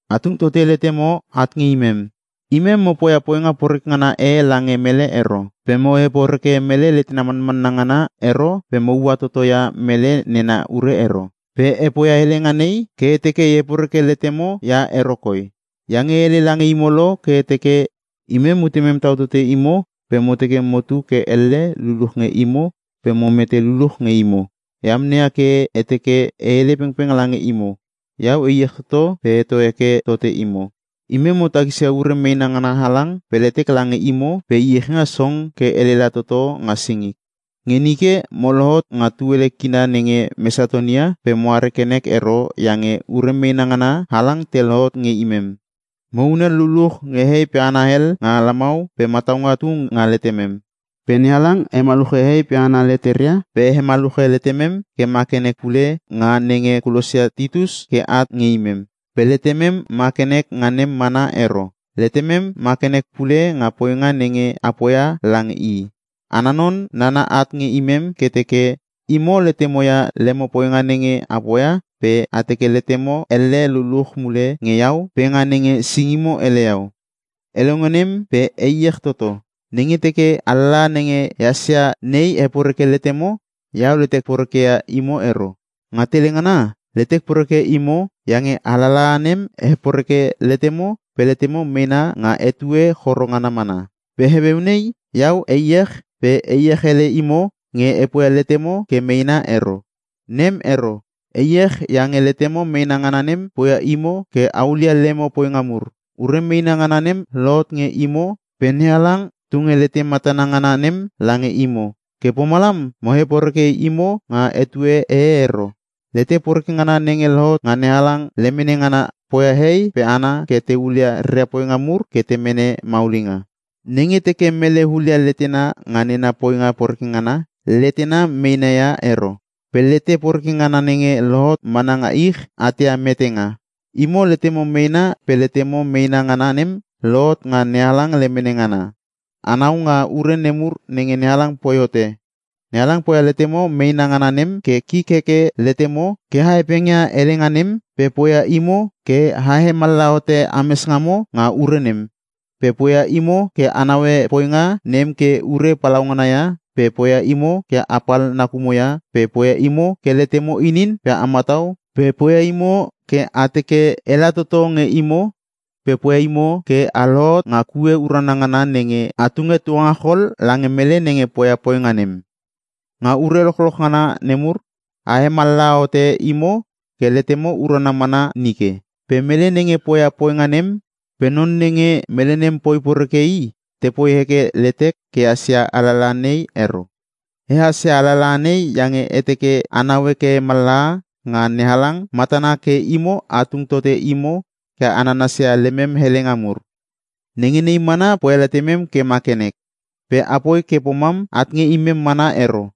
A tung tote letemo at nge imem. Imem mo poia poinga poreke ngana e lange mele ero, pe mo heporeke mele letena manmanna ngana ero pe moua toto ia mele nena ure ero. Pe e poia helenga nei ke e teke e heporeke letemo ia ero koi. Iange e hele lange imo lo ke e teke: Imem mutemem tau tote imo pe mo teke motu ke elle luluch nge imo pe mo mete luluch nge imo. E amneia ke e teke e hele pengpeng lange imo. Iau e iech toto pe e heto heke tote imo. Imem mo takisia ure meena ngana halang pe letek lange imo pe iechinga song ke elela toto nga singik. Nge nike mo lohot nga tuele kina nenge Mesatonia pe mo are ke nek ero iange ure meena ngana halang te lohot nge imem. Mo hunel luluch nge hehei pe hana hel nga lamau pe mataunga tu nga letemem. Pe NeHalang hemaluche hehei pe hana leteria pe hemaluche letemem ke ma ke nek pule nga nenge kulosia Titus ke at nge imem. Pe letemem ma ke nek nga nem mana ero, letemem ma ke nek pule nga poinga nenge a poia lange i. Ana non nana at nge imem ke teke: Imo letemo ia lemo poinga nenge a poia pe a teke letemo elle luluch mule nge iau pe nga nenge singimo ele iau. E longe nem pe e iech toto. Nenge teke alalaha nenge ehas ia nei heporeke letemo, iau letek porekeia imo ero. Nga tele ngana letek porekeia imo iange alalaha nem heporeke letemo pe letemo meena nga etue choro ngana mana. Pe heueu nei iau e iech pe e iech ele imo nge e poia letemo ke meena ero. Nem ero. E iech iange letemo meena ngana nem poia imo ke a hulia lemo poinga mur. Ure meena ngana nem lohot nge imo pe NeHalang tunge lete matana ngana nem lange imo. Ke pomalam mo heporeke imo nga ute e ero. Lete poreke ngana nenge lohot nga NeHalang lemene ngana poia hehei pe hana ke te hulia reria poinga mur ke te mene maulinga. Nenge teke mele hulia letena nga nena poinga poreke ngana, letena meena ia ero. Pe lete poreke ngana nenge lohot mana nga ich, at ia metenga. Imo letemo meena pe letemo meena ngana nem lohot nga NeHalang lemene ngana. Anau nga ure nemur nenge NeHalang poi hote. NeHalang poia letemo meena ngana nem ke; Kik heke letemo ke a hepengia helenga nem, pe poia imo ke a hemallaha hote ames ngamo nga ure nem, pe poia imo ke a naue poinga nem ke i ure palaungana ia pe poia imo ke apal nakumo ia pe poia imo ke letemo inin pe a matau pe poia imo ke a teke ela toto nge imo pe poia imo ke a lohot nga kue urana ngana nenge a tunge tuangachol lange mele nenge poia poinga nem. Nga ure lochloch ngana nemur a hemallaha hote imo ke letemo urana mana nike. Pe mele nenge poia poinga nem pe non nenge mele nem poi poreke i, tepoi heke letek ke ehas ia alalaha nei ero. E hasia alalaha nei, iange e teke a naue ke mallaha nga NeHalang matana ke imo a tung tote imo ke a nanasia lemem helenga mur. Nenge nei mana poia letemem ke ma ke nek. Pe apoi ke pomam at nge imem mana ero.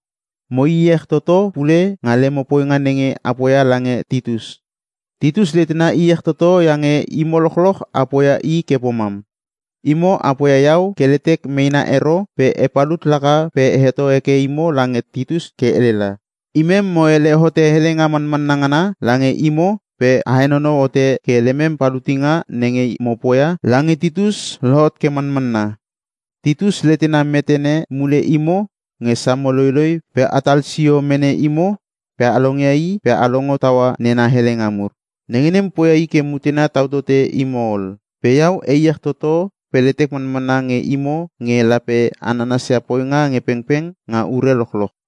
Mo iech toto pule nga lemo poinga nenge a poia lange Titus. Titus letena iech toto iange imo lochloch a poia i ke pomam. Imo a poia iau ke letek meena ero pe e palut laka pe e heto heke imo lange Titus ke elela. Imem mo hele hote helenga manmanna ngana lange imo pe a henonou hote ke lemem palutinga nenge mo poia lange Titus lohot ke manmanna. Titus letena metene mule imo nge samo loiloi pe a talsio mene imo pe a longia i pe a longo taua nena helenga mur. Nenge nem poia i ke mutena tau tote imo ol. Pe iau e iech toto pe letek manmanna nge imo nge lape a nanasia poinga nge pengpeng nga ure lochloch.